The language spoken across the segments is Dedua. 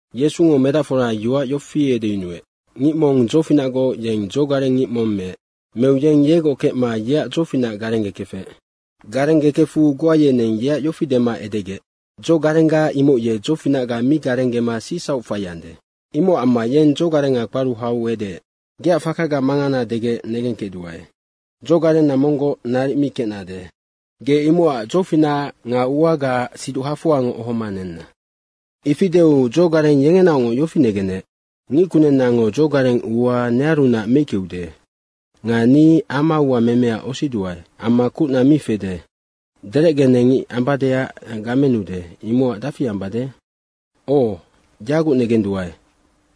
Yesungo medacfora yoac yofi edeyunuec, “Ngic mong dzofinacgoc yeng dzogareng ngic mong meec. Meu yeng yegoc kecma yeac dzofinac garenggekefec. Garenggekefu goa yeneng yeac yofi dema edegec, ‘Dzogarengga imoc ye dzofinacga mi garenggema sicsauc faiande.’ Imocac amma yeng dzogarenga kparu hau edeec, ‘Geac fakaga mangana degec negengkecduae. Dzogarenna monggoc naric mi kecnade. Ge imocac dzofinacac nga uagaac siduc hafoangoc ohoma nenna.’ Ifi deu dzogareng yengenaocngoc yofi negenec, ‘Ngickunennango dzogareng ua nearunac meickeude. Nga ni ama uamemeac osiduae amma kucna mi fede, derecgenecngic ambadeac gamenude, imocac dafi ambade?’ ‘O, yaguc negenduae.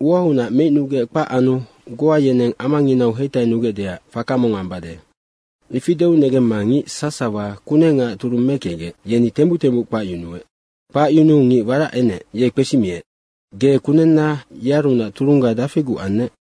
Uaunac meicnugec kpac anu goa yeneng amanginau heitainugecdeac faka mong ambade.’ Ifi negemma ngic sasawa kunengaac turung mekecgec, yeni tembuc tembuc kpacyunuec. Kpacyunuu ngic warac enec, ye kpesimiec, ‘Ge kunenna yearunac turungga dafiguc annec?’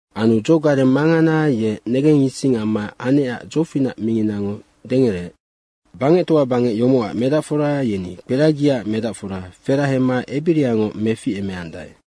Anu dzogareng mangana ye negengising amma anecac dzofinac minginango dengereec. Nocac bangectoa bangec yomocac medacfora yeni kperagiaac medacfora ferahema ebiriangoc meficemeandae.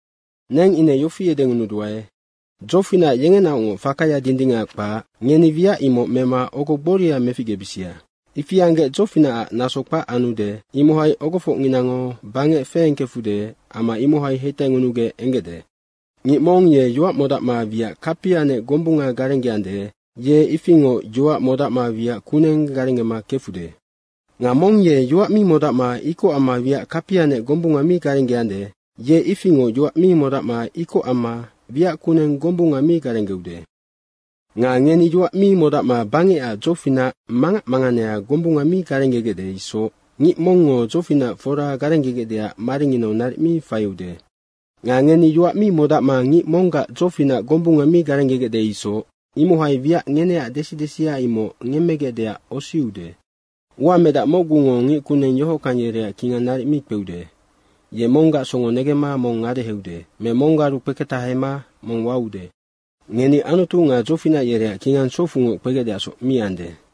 Neng ine yofi edengunuduae, dzofinac yengenaocngoc fakaya dindingac kpac, ngeni wiac imoc mema ogo gboria meficgebisia. Ifi anggec dzofinacac naso kpac anude, imohai ogofocnginango bangec feengkefude, ama imohai heitaingunugec enggecde. Ngic mong ye yoac modacma wiac kapianec gombunga garenggeande, ye ifingoc yoac modacma wiac kuneng garenggema kefude. Nga mong ye yoac mi modacma ikoc amma wiac kapianec gombunga mi garenggeande, ye ifingoc yoac mi modacma ikoc amma wiac kuneng gombunga mi garenggeude. Nga ngeni yoac mi modacma bangecac dzofinac mangac manganea gombunga mi garenggegecde isoc ngic mongngo dzofinac fora garenggegecdeac maringinau naric mi faiude. Nga ngeni yoac mi modacma ngic monggac dzofinac gombunga mi garenggegec isoc, imohai wiac ngeneac desi desia imoc ngemmegecdeac osiude. Uamedac mocgungo ngic kuneng yohockang yereac kingang naric mi kpeude. Ye monggac songo negemma mong ngadeheude me monggaru kpeketahema mong waude. Ngeni, Anutu nga dzofinac yereac kingang sofucngoc kpegecdeacsoc mi ande.”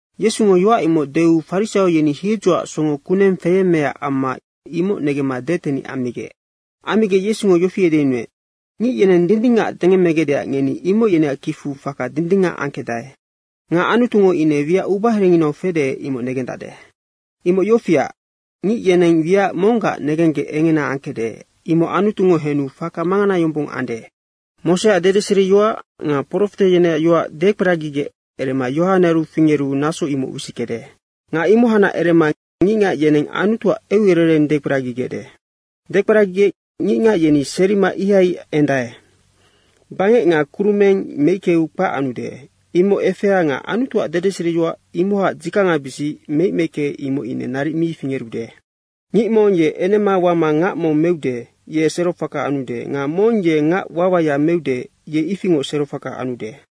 Yesungo yoac imoc deu farisaio yeni hiedzoac songo kuneng feyemmeecac amma imoc negemma detenic ammigec. Ammigec Yesungo yofi edeyunuec, “Ngic yeneng dindingac dengemmegecdeac ngeni imoc yeneac kicfu faka dindingac angkecdae. Nga Anutungo ine wiac ubaherenginau fede, imoc negendacde. Imoc yofiac, ngic yeneng wiac monggac negenggec engena angkecde, imoc Anutungo henu faka mangana yombong ande. Moseac dedeseriyoac nga profete yeneac yoac dekperagigec erema Yohane fingeru naso imoc wisickede. Nga imohacnac erema ngicngac yeneng Anutuac eucerereng dekperagigecde. Dekperagigec ngicngac yeni serima ihai endae. Bangec nga kurumeng meickeu kpac anude, imoc efea nga Anutuac dedeseriyoac imohacnac dzikangabisic meic meicke imoc ine naric mi fingerude. Ngic mong ye enema wama ngac mong meude, ye serofaka anude nga mong ye ngac wawaya meude, yeng ifingoc serofaka anude.”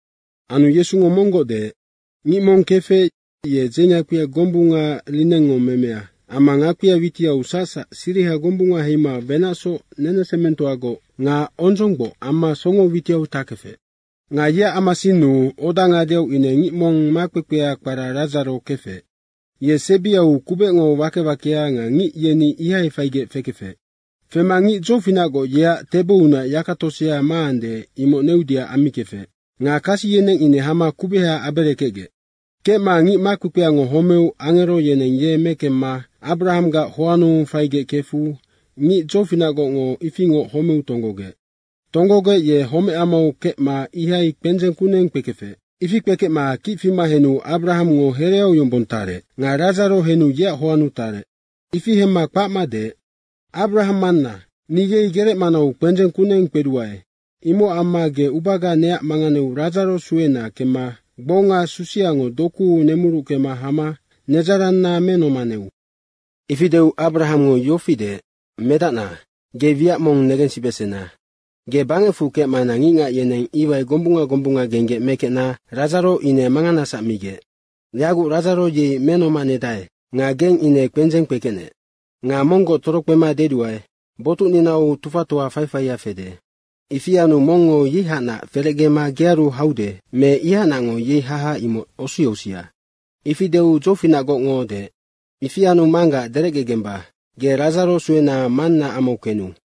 Anu Yesungo monggoc deec, “Ngic mong kefec, ye dzeingakpia gombunga linengngo memea amma ngakpia witiau sacsac siriha gombunga heima wenacsoc nenesemengtoagoc nga ondzonggboc amma songo witiau takefec. Nga yeac amasinnu, oda ngadeau ine ngic mong makpekpea kpara Radzaro kefec. Ye sebiau kubecngo wake wakea nga ngic yeni ihai faigec fekefec. Fema ngic dzofinacgoc yeac tebounac yaka tosea maande, imoc neudeac ammikefec. Nga kasi yeneng ine hama kubeha aberekecgec. Kecma ngic makpekpeango homeu angero yeneng ye mekemma Abrahanggac hoannu faigec kefu ngic dzofinacgocngo ifingoc homeu tonggogec. Tonggogec ye homecamau kecma ihai kpendzeng kuneng kpekefec. Ifi kpekecma kic fima henu Abrahangngo hereau yombong tarec nga Radzaro henu yeac hoannu tarec. Ifi hemma kpacma deec, ‘Abrahang manna, ni yei gerec manau kpendzeng kuneng kpeduae, imocac amma ge ubaga neac manganeu Radzaro suena kemma gbonga susiango dokuu nemurucke hama nedzaranna menomaneu.’ Ifi deu Abrahangngo yofi deec, ‘Medacna, ge wiac mong negensibesena. Ge bangecfu kecmana ngicngac yeneng iwai gombunga gombunga genggec mekecna Radzaro ine manganasac migec. Yaguc Radzaro yei menomanedae nga geng ine kpendzeng kpekecnec. Nga monggoc torokpema deduae, botucninau tufatoa faifaia fede. Ifi anu mongngo yeihacnac ferecgema gearu haude me ihacnacngo yei haha, imoc osiosia.’ Ifi deu dzofinacgocngo deec, ‘Ifi anu manggac derecgegemba, ge Radzaro suena mannaac amau kenu.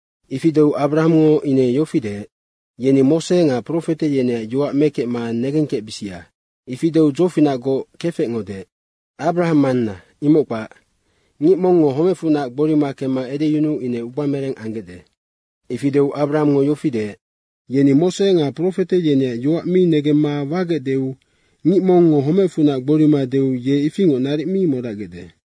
Ifi deu Abrahangngo ine yofi deec, ‘Yeni Mose nga profete yeneac yoac mekecma negengkecbisia.’ Ifi deu dzofinacgoc kefecngo deec, ‘Abrahang manna, imoc kpac. Ngic mongngo homecfunac gborima kemma edeyunuu ine ubamereng anggecde.’ Ifi deu Abrahangngo yofi deec, ‘Yeni Mose nga profete yeneac yoac mi negemma wagecdeu ngic mongngo homecfunac gborima deu ye ifingoc naric mi modacgecde.’”